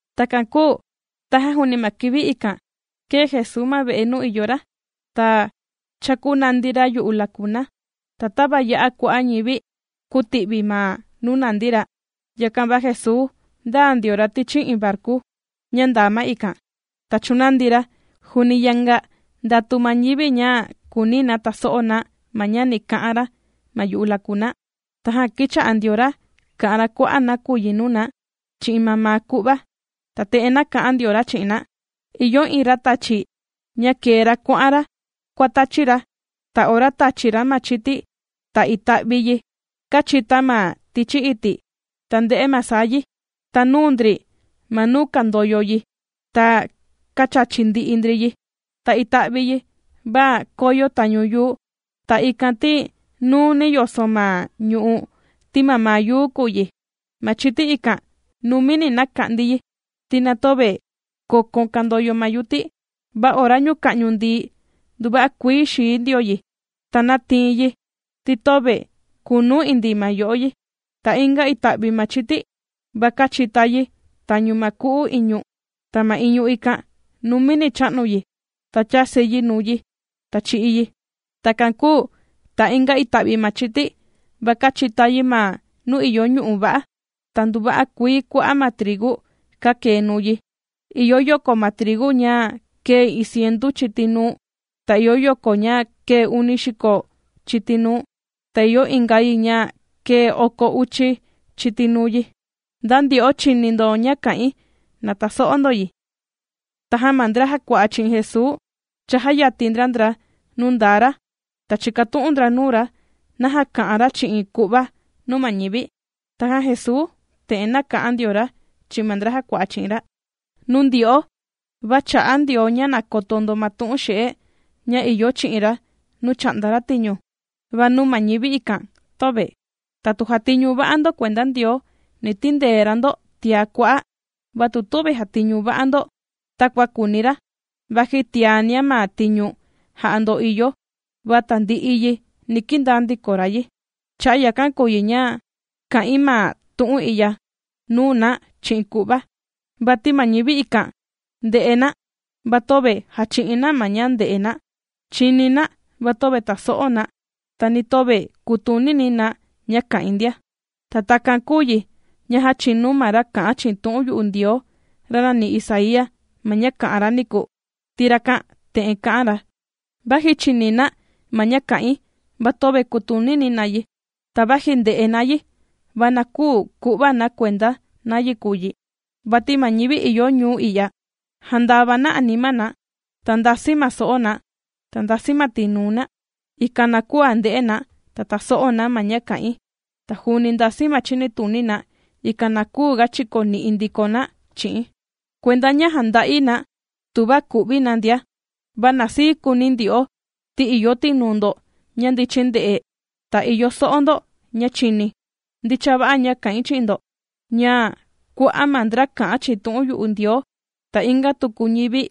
Takan kūu tajan juuni ma kivi ikan, kēe Jesuu ma ve'e nuu ìyo ra, ta chākunandi ra yu'u lakuna. Ta tava ya'a kua'a' ñivi kūti'vi ma nuu nàndi ra, yakan va Jesuu ndāa ndio ra tichi iin varku ña ndaa ma ikan, ta chūnandi ra, juuni yanga ndatu ma ñivi ña kùuni na taso'o na ma ña ni ka'an ra ma yu'u lakuna. Tajan kīcha'a ndio ra kà'an ra kua'a' nakuyi nuu na chi'in mamaa ku'va. Ta te'en nāka'an ndio ra chi'in na: ―Ìyo iin ra tàchi, ña kēe ra kuà'an ra kuàtachi ra. Ta ora tāchi ra ma chiti, ta ita'vi yi kāchita ma tichi iti', ta ndē'e ma saa yi, ta nūu ndri ma nuu kàndoyo yi, ta kāchachi ndi'i ndri yi. Ta ita'vi yi va kōyo tañu yuu. Ta ikan ti nuuni yoso ma ñu'u', ti mamaa yuu kùu yi. Ma chiti ikan numini nāka'ndi yi, ti na töve kokon kandoyo ma yuti. Va ora ñuka'ñu ndií, nduva'a kuii xīi ndio yi, ta nātii yi, ti töve kunu indii ma yo'o yi. Ta inga ita'vi ma chiti, va kāchita yi tañu ma ku'u iñu, ta ma iñu ikan numini chā'nu yi, ta chāsi yi nuu yi, ta chī'i yi. Takan kūu ta inga ita'vi ma chiti, va kāchita yi ma nuu ìyo ñu'u' va'a, ta nduva'a kuii kua'a' ma trigu kākee nuu yi, ìyo yoko ma trigu ña kēe iin cientu chiti nuu, ta ìyo yoko ña kēe uni xiko chiti nuu, ta ìyo inga yi ña kēe oko uchi chiti nuu yi. Nda ndyo'o chìni ndo ña kà'in, na taso'o ndo yi. Tajan ma ndra jàkua'a chi'in Jesuu cha jàyatin ndra ndra nuu ndaa ra, ta chīkatu'un ndra nuu ra naja kà'an ra chi'in ku'va nuu ma ñivi. Tajan Jesuu te'en nāka'an ndio ra chi'in ma ndra jàkua'a chi'in ra: ―Nuu ndyo'o va chà'a Ndioo ña na koto ndo ma tu'un xe'e ña ìyo chi'in ra nuu chà'nda ra tiñu, va nuu ma ñivi ikan, töve. Ta tu jàtiñu va'a ndo kuenda Ndioo, ni tindee ra ndo tiá kua'a'. Va tu tüvi jàtiñu va'a ndo takua kùuni ra, vaji tiania ma tiñu jà'a ndo ìyo, va tandi'i yi ni kindaa ndiko ra yi. Cha'a' yakan kùu yi ña kà'in ma tu'un i'ya nuu na chi'in ku'va. Vati ma ñivi ikan ndè'e na, va töve jàchi'in na ma ña nde'e na, chini na, va töve taso'o na, ta ni töve kutunini na ña kà'in ndia. Ta takan kūu yi ña jāchinu ma ra kā'an chi'in tu'un yu'u Ndioo, ra nàni Isaía ma ña kā'an ra niku, ti rakan te'en kā'an ra: Vaji chìni na, ma ña kà'in, va töve kutunini na yi. Ta vaji ndè'e na yi, va na küu ku'va na kuenda nayi kùu yi. Vati ma ñivi ìyo ñuu i'ya, jàndava na anima na, ta ndasi ma so'o na, ta ndàsi ma tinuu na, ikan na küu nde'e na, ta tàso'o na ma ña kà'in. Ta juuni ndasi ma chinituni na, ikan na küu ga chikoni'i ndiko na chi'i̱n, kuenda ña jànda'i na tuva ku'vi na ndia. ’Va na sii kuuni ndyo'o, ti ìyo tinuu ndo ña ndichin ndè'e, ta ìyo so'o ndo ña chìni. Ndicha va'a ña kà'in chi'in ndo, ña kua'a' ma ndra kā'an chi'in tu'un yu'u Ndioo, ta inga tuku ma ñivi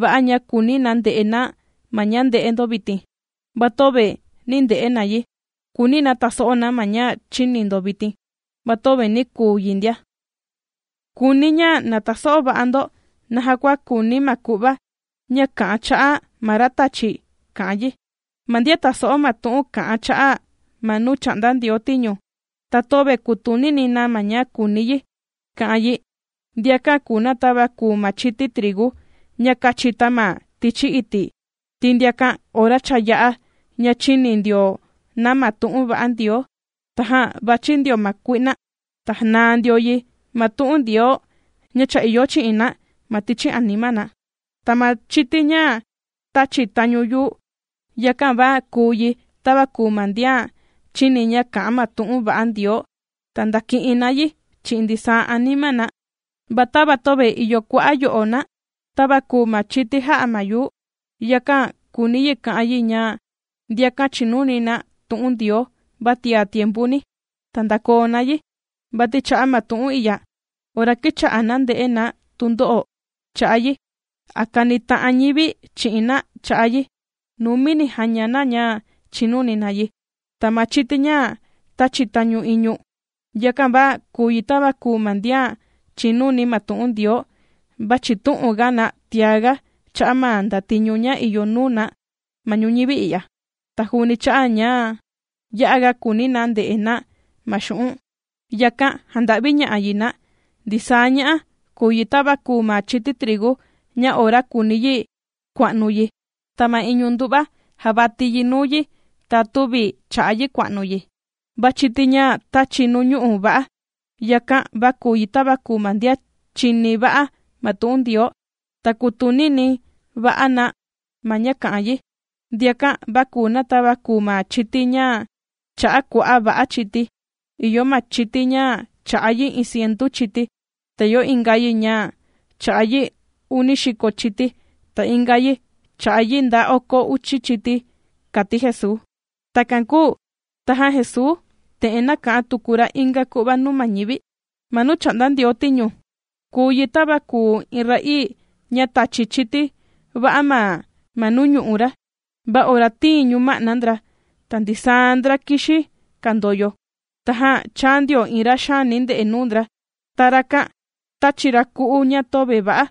va'a ña kūuni na nde'e na ma ña ndè'e ndo vitin, va töve nī nde'e na yi. Kūuni na tàso'o na ma ña chìni ndo vitin, va töve nī kuu yi ndia. ’Kùuni̱ ña na taso'o va'a ndo naja kua kùuni ma ku'va ña kà'an cha'a' ma ra tàchi ka'an yi. Ma ndian tàso'o ma tu'un kà'an cha'a' ma nuu chà'nda Ndioo tiñu, ta töve kùtunini na ma ña kùuni yi ka'an yi, ndiakan kùu na tava kùu ma chiti trigu ña kāchita ma tichi iti', ti ndiakan ora cha yā'a ña chīni ndio na ma tu'un va'a Ndioo, tajan vàchi ndio ma kui'na, ta janaa ndio yi ma tu'un Ndioo ña cha ìyo chi'in na ma tichi anima na. Ta ma chiti ña tāchi tañu yuu, yakan va kùu yi, tava kùu ma ndian chìni ña kà'an ma tu'un va'a Ndioo, ta ndàki'in na yi chi'in ndisaa anima na, va tava töve ìyo kua'a' yo'o na, tava kùu ma chiti jà'a ma yuu, yakan kùuni yi ka'an yi ña ndiakan chìnuni na tu'un Ndioo va tia tiempuni, ta ndàkoo na yi. Vati cha'a' ma tu'un i'ya, ora kìcha'a na ndè'e na tundo'o cha'a' yi a kànita'an ñivi chi'in na cha'a' yi, numini jàña na ña chìnuni na yi. Ta ma chiti ña tāchi tañu iñu, yakan, va kùu yi tava kùu ma ndian chìnuni ma tu'un Ndioo, va chìtu'un ga na tiaga cha'a' ma ndatiñu ña ìyo nuu na ma ñuñivi i'ya, ta juuni cha'a' ña ya'a ga kùuni na nde'e na ma xu'un', yakan jànda'viña'a yi na. Ndisaa ña'a kùu yi tava kùu ma chiti trigu ña ora kùuni yi kua'nu yi, ta ma iñu ndu'va jàvati yi nuu yi, ta tüvi chà'a yi kua'nu yi. Va chiti ña tāchi nuu ñu'u' va'a, yakan, va kùu yi tava kùu ma ndian chìni va'a ma tu'un Ndioo, ta kùtunini va'a na ma ña kà'an yi, ndiakan va kùu na tava kùu ma chiti ña chā'a kua'a' va'a chiti. Ìyo ma chiti ña chà'a yi iin cientu chiti, ta ìyo inga yi ña chà'a yi uni xiko chiti, ta inga yi chà'a yi nda oko uchi chiti ―kàti Jesuu. Takan kūu tajan Jesuu te'en nāka'an tuku ra inga ku'va nuu ma ñivi: ―Ma nuu chà'nda Ndioo tiñu, kùu yi tava kùu iin ra'ii ña tāchi chiti va'a ma nuu ñu'u' ra, va ora tīin ñuma'na ndra, ta ndisaa ndra kìxi kàndoyo, tajan chāa iin ra xaani ndè'e nuu ndra, ta rakan tāchi ra ku'u ña töve va'a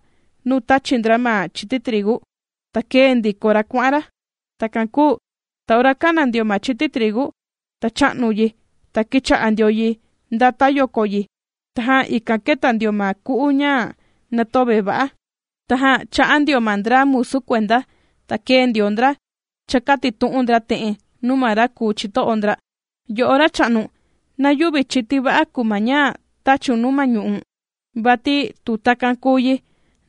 nuu tāchi ndra ma chiti trigu, ta kēe ndiko ra kuà'an ra. Takan kūu ta ora kāna ndio ma chiti trigu, ta chā'nu yi, ta kīcha'a ndio yi ndata yoko yi, tajan ikan kēta ndio ma ku'u ña na töve va'a. Tajan chā'a ndio ma ndra musu kuenda, ta kēe ndio ndra chākatitu'un ndra te'en nuu ma ra kùu chito'o ndra: “Yo'o racha'nu, ¿na yüvi chiti va'a kùu ma ña tāchiun nuu ma ñu'u̱n? Vati tu takan kùu yi,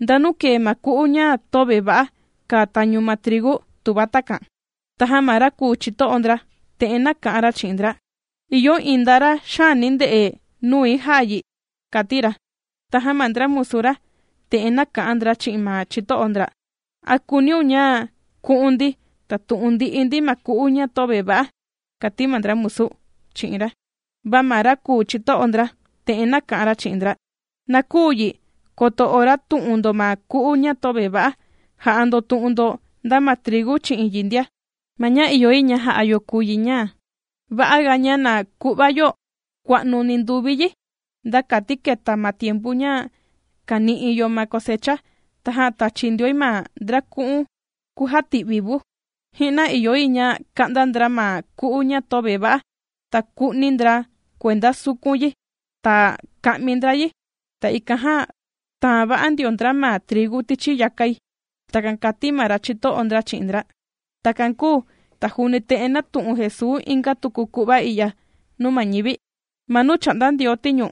¿ndanu kēe ma ku'u ña töve va'a kàa tañu ma trigu tuva takan?” Tajan ma ra kùu chito'o ndra, te'en nāka'an ra chi'in ndra: “Ìyo iin nda ra xaani ndè'e nui jā'a yi”, kàti ra. Tajan ma ndra musu ra, te'en nāka'an ndra chi'in ma chito'o ndra: “¿A kùuniun ña ku'un ndi, ta tu'un ndi'i ndi ma ku'u ña töve va'a?”, kàti ma ndra kùu musu chi'in ra. Va ma ra kùu chito'o ndra, te'en nāka'an ra chi'in ndra: “Na küu yi, koto ora tù'un ndo ma ku'u ña töve va'a, jà'a ndo tu'un ndo nda ma trigu chi'in yi ndia. Ma ña ìyo yi ña ja'a yo kùu yi ña va'a ga ña na ku'va yo kua'nu ninduvi yi, nda kati keta ma tiempu ña kàni'i yo ma cosecha, tajan tachi ndioi ma ndra ku'un kujati'vi vu. Ji'na ìyo yi ña kà'nda ndra ma ku'u ña töve va'a, ta ku'ni ndra kuenda sukun yi, ta ka'mi ndra yi, ta ikan jan taan va'a ndio ndra ma trigu tichi yakai.” Takan kàti ma ra chito'o ndra chi'in ndra. Takan kūu ta juuni te'en nātu'un Jesuu inga tuku ku'va i'ya nuu ma ñivi ndia: ―Ma nuu chà'nda Ndioo tiñu,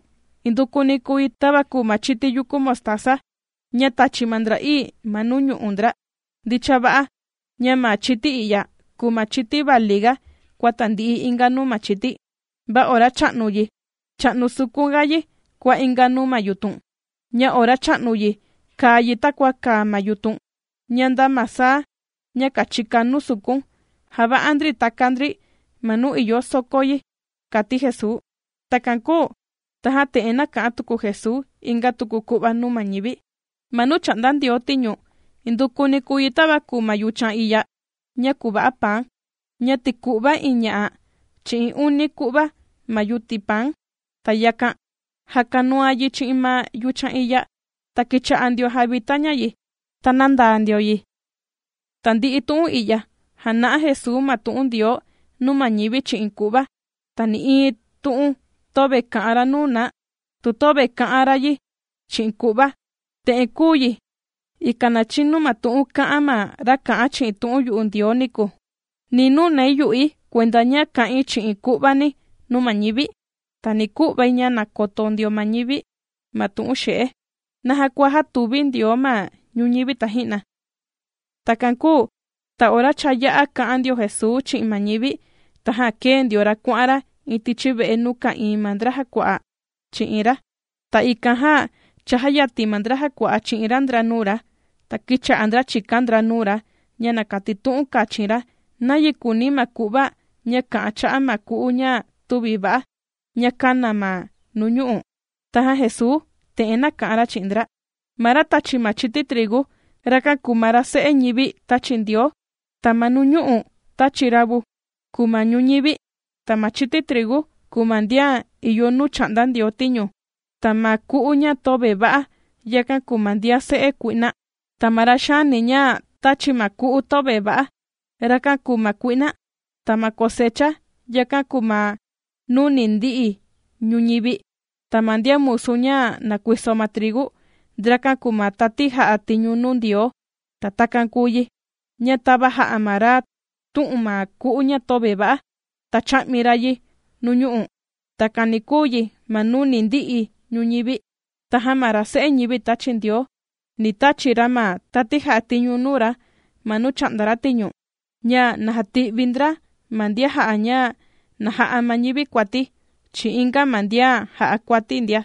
indukuni kùu yi tava kùu ma chiti yukú mostaza ña tàchi ma ndra'ii ma nuu ñu'u' ndra. Ndicha va'a ña ma chiti i'ya kùu ma chiti vali ga kua tandi'i inga nuu ma chiti, va ora chà'nu yi, chà'nu sukun ga yi kua inga nuu ma yutun, ña ora chà'nu yi kàa yi takua kàa ma yutun, ña nda ma saa ña kàchika nuu sukun, jàva'a ndri taka ndri ma nuu ìyo sokó yi ―kàti Jesuu. Takan kūu tajan te'en nāka'an tuku Jesuu inga tuku ku'va nuu ma ñivi: ―Ma nuu chà'nda Ndioo tiñu, indukuni kùu yi tava kùu ma yuchan iya ña kuva'a paan, ña tīku'va iin ña'a chi'in uni ku'va ma yuti paan, ta yakan jàkanuan yi chi'in ma yuchan iya, ta kīcha'a ndioan jàvita ña yi, ta nàndaa ndio yi. Tandi'i tu'un i'ya jāna'a Jesuu ma tu'un Ndioo nuu ma ñivi chi'in ku'va. Ta nï'iin tu'un töve kà'an ra nuu na tu töve kà'an ra yi chi'in ku'va. Te'en kūu yi, ikan na chinu ma tu'un kā'an ma ra kā'an chi'in tu'un yu'u Ndioo niku: Ni nunai yu'i kuenda ña kā'in chi'in ku'vani nuu ma ñivi, ta ni ku'vai ña na koto ndio ma ñivi ma tu'un xe'e, naja kua jātuvi Ndioo ma ñuñivi taji'na. Takan kūu ta ora cha yā'a kā'an ndio Jesuu chi'in ma ñivi, tajan kēe ndio ra kuà'an ra iin tichi ve'e nuu ka'ìin ma ndra jàkua'a chi'in ra. Ta ikan jan chājayatin ma ndra jakua'a chi'in ra ndra nuu ra, ta kīcha'a ndra chìkan ndra nuu ra ña na katitu'un kachin ra, nayi kùuni ma ku'va ña kà'an cha'a ma ku'u ña tüvi va'a, ña kāna ma nuñu'u'. Tajan Jesuu te'en nāka'an ra chi'in ndra: ―Ma ra tachi ma chiti trigu, rakan kùu ma ra Se'e ñivi tāchi Ndioo. Ta ma nuñu'u' tāchi ra vu, kùu ma ñuñivi. Ta ma chiti trigu kùu ma ndian ìyo nuu chà'nda Ndioo tiñu, ta ma ku'u ña töve va'a yakan kùu ma ndian se'e kui'na. Ta ma ra xaani ña tāchi ma ku'u töve va'a, rakan kùu ma kui'na. Ta ma cosecha, yakan kùu ma nuu ni ndi'i ñuñivi. Ta ma ndian musu ña nàkuiso ma trigu, ndrakan kùu ma tati jà'a tiñu nuu Ndioo. Ta takan kùu yi, ña tava jā'a ma ra tū'un ma ku'u ña töve va'a, ta chā'mi ra yi nuu ñu'ú, takan ni kùu yi ma nuu ni ndi'i ñuñivi. Tajan ma ra Se'e ñivi tāchi Ndioo, ni tachi ra ma tati jà'a tiñu nuu ra ma nuu chà'nda ra tiñu, ña na jati'vi ndra ma ndian jà'a ña na ja'a ma ñivi kuati, chi'in inga ma ndian jà'a kuati ndia.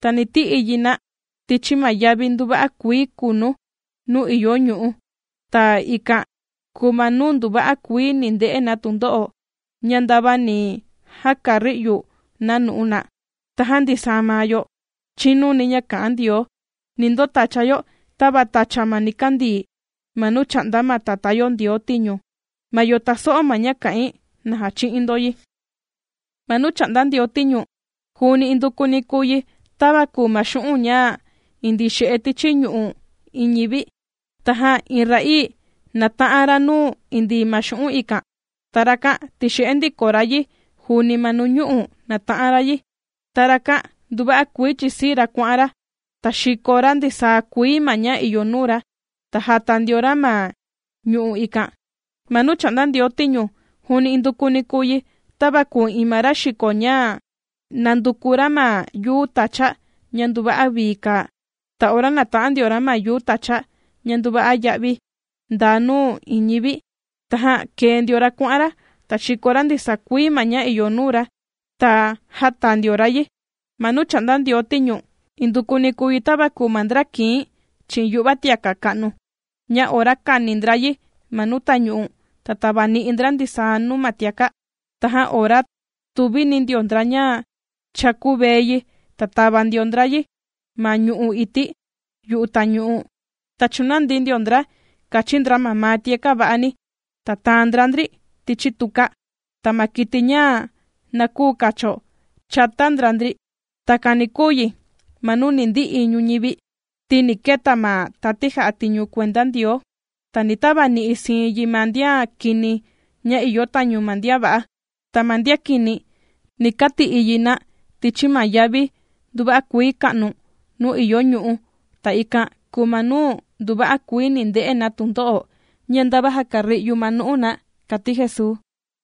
Ta ni ti'i yi na tichi ma yavi nduva'a kuii kunu nuu ìyo ñu'ú, ta ikan kùu ma nuu nduva'a kuii ni nde'e na tundo'o ña ndava ni jakari'yu na nu'u na. Tajan ndisaa ma yo chìnuni ña kà'an Ndioo, ni ndotacha yo tava tacha ma nikandii, ma nuu chà'nda ma Tatá yo Ndioo tiñu. Ma yo tàso'o ma ña kà'in, na jachi'in ndo yi. ’Ma nuu chà'nda Ndioo tiñu, juuni indukuni kùu yi, tava kùu ma xu'un' ña indii xe'e tichi ñu'u' iin ñivi. Tajan iin ra'ii nàta'an ra nuu indii ma xu'un' ikan, ta rakan tīxe'e ndiko ra yi juuni ma nuñu'u' nāta'an ra yi, ta rakan nduva'a kuii chìsii ra kuà'an ra, ta xìko ra ndisaa kuii ma ña ìyo nuu ra, ta jàta ndio ra ma ñu'u' ikan. ’Ma nuu chà'nda Ndioo tiñu, juuni indukuni kùu yi, tava kùu iin ma ra xiko ña nànduku ra ma yuu tacha ña nduva'a vii kàa. Ta ora nāta'an ndio ra ma yuu tacha ña nduva'a ya'vi ndaa nuu iin ñivi, tajan kēe ndio ra kuà'an ra, ta xīko ra ndisaa kuii ma ña ìyo nuu ra, ta jāta ndio ra yi. ’Ma nuu chà'nda Ndioo tiñu, indukuni kùu yi tava kùu ma ndra kìin chi'in yu'va tiaka' ka'nu, ña ora kani ndra yi ma nuu tañu'u, ta tàvani'i ndra ndisaa nuu ma tiaka'. Tajan ora tuvini ndio ndra ña cha kuvee yi, ta tàva ndio ndra yi ma ñu'u' ití yu'u tañu'u, ta chùnandi ndio ndra kàchin ndra mamaa tiaka' va'a ni, ta tàan ndra ndri tichi tuka, ta ma kiti ña na küu kacho, chàta ndra ndri. Takan ni kuu yi ma nuu ni ndi'i ñuñivi, ti ni keta ma tati jà'a tiñu kuenda Ndioo, ta ni tavani'i siin yi ma ndian kini ña ìyo tañu ma ndian va'a. Ta ma ndian kini, ni kati'i yi na tichi ma yavi nduva'a kuii ka'nu, nuu ìyo ñu'ú, ta ikan kùu ma nuu nduva'a kuii ni nde'e na tundo'o ña ndava jakari'yu ma nu'u na ―kàti Jesuu.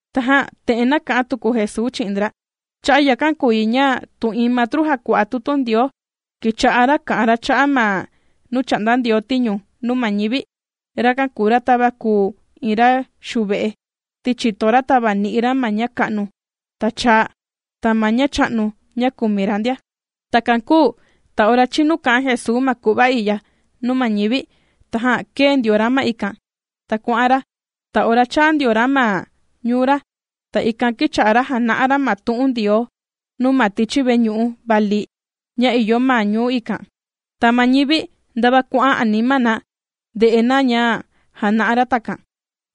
Tajan te'en nāka'an tuku Jesuu chi'in ndra: ―Cha'a' yakan kùu yi ña tu iin matru jàkua'a tutu Ndioo, kīcha'a ra kà'an ra cha'a' ma nuu chà'nda Ndioo tiñu nuu ma ñivi, rakan kùu ra tava kùu iin ra xuve'e, ti chìto ra tàvani'i ra ma ña ka'nu, ta chaa, ta ma ña cha'nu ña kumi ra ndia. Takan kūu ta ora chinu kā'an Jesuu ma ku'va i'ya nuu ma ñivi, tajan kēe ndio ra ma ikan, ta kuà'an ra. Ta ora chāa ndio ra ma ñuu ra, ta ikan kīcha'a ra jàna'a ra ma tu'un Ndioo nuu na ma tichi veñu'u vali ña ìyo ma ñuu ikan. Ta ma ñivi ndava kuà'an anima na ndè'e na ña jàna'a ra takan,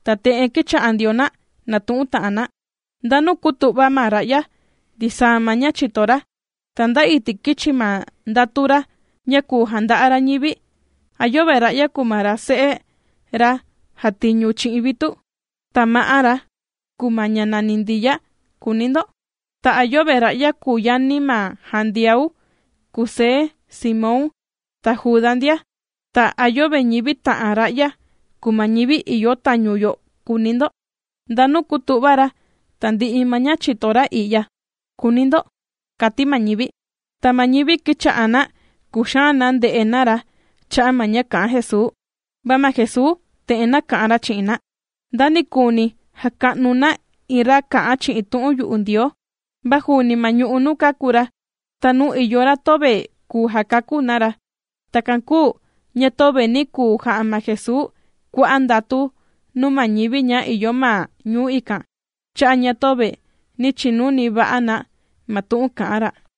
ta te'en kīcha'a ndio na nàtu'un ta'an na: ―¿Ndanu kūtu'va ma ra'ya ndisaa ma ña chìto ra? ¿Ta nda iti' kīchi ma ndatu ra ña kùu janda'a ra ñivi? ¿A yöve ra'ya kùu ma ra se'e, ra jàtiñu chi'in vitu, ta ma'á ra kùu ma ña nàni Ndiya?, kùuni ndo. Ta, ¿a yöve ra'ya kùu yani ma Jandiau, Kusé, Simón, ta Juda ndia? ¿Ta a yöve ñivi ta'an ra'ya kùu ma ñivi ìyo tañu yo?, kùuni ndo. ¿Ndanu kūtu'va ra tandi'i ma ña chìto ra i'ya?, kùuni ndo ―kàti ma ñivi. Ta ma ñivi kīcha'a na kùxaan na nde'e na ra cha'a ma ña kà'an Jesuu. Va ma Jesuu te'en nāka'an ra chi'in na: ―Nda nikuuni jàka'nu na iin ra kà'an chi'in tu'un yu'u Ndioo, va juuni ma ñu'u' nuu kāku ra, ta nuu ìyo ra töve kùu jakakú na ra. Takan kūu ña töve nī kuu ja'a ma Jesuu kua'a' ndatu nuu ma ñivi ña ìyo ma ñuu ikan cha'a' ña töve nī chinuni va'a na ma tu'un kà'an ra.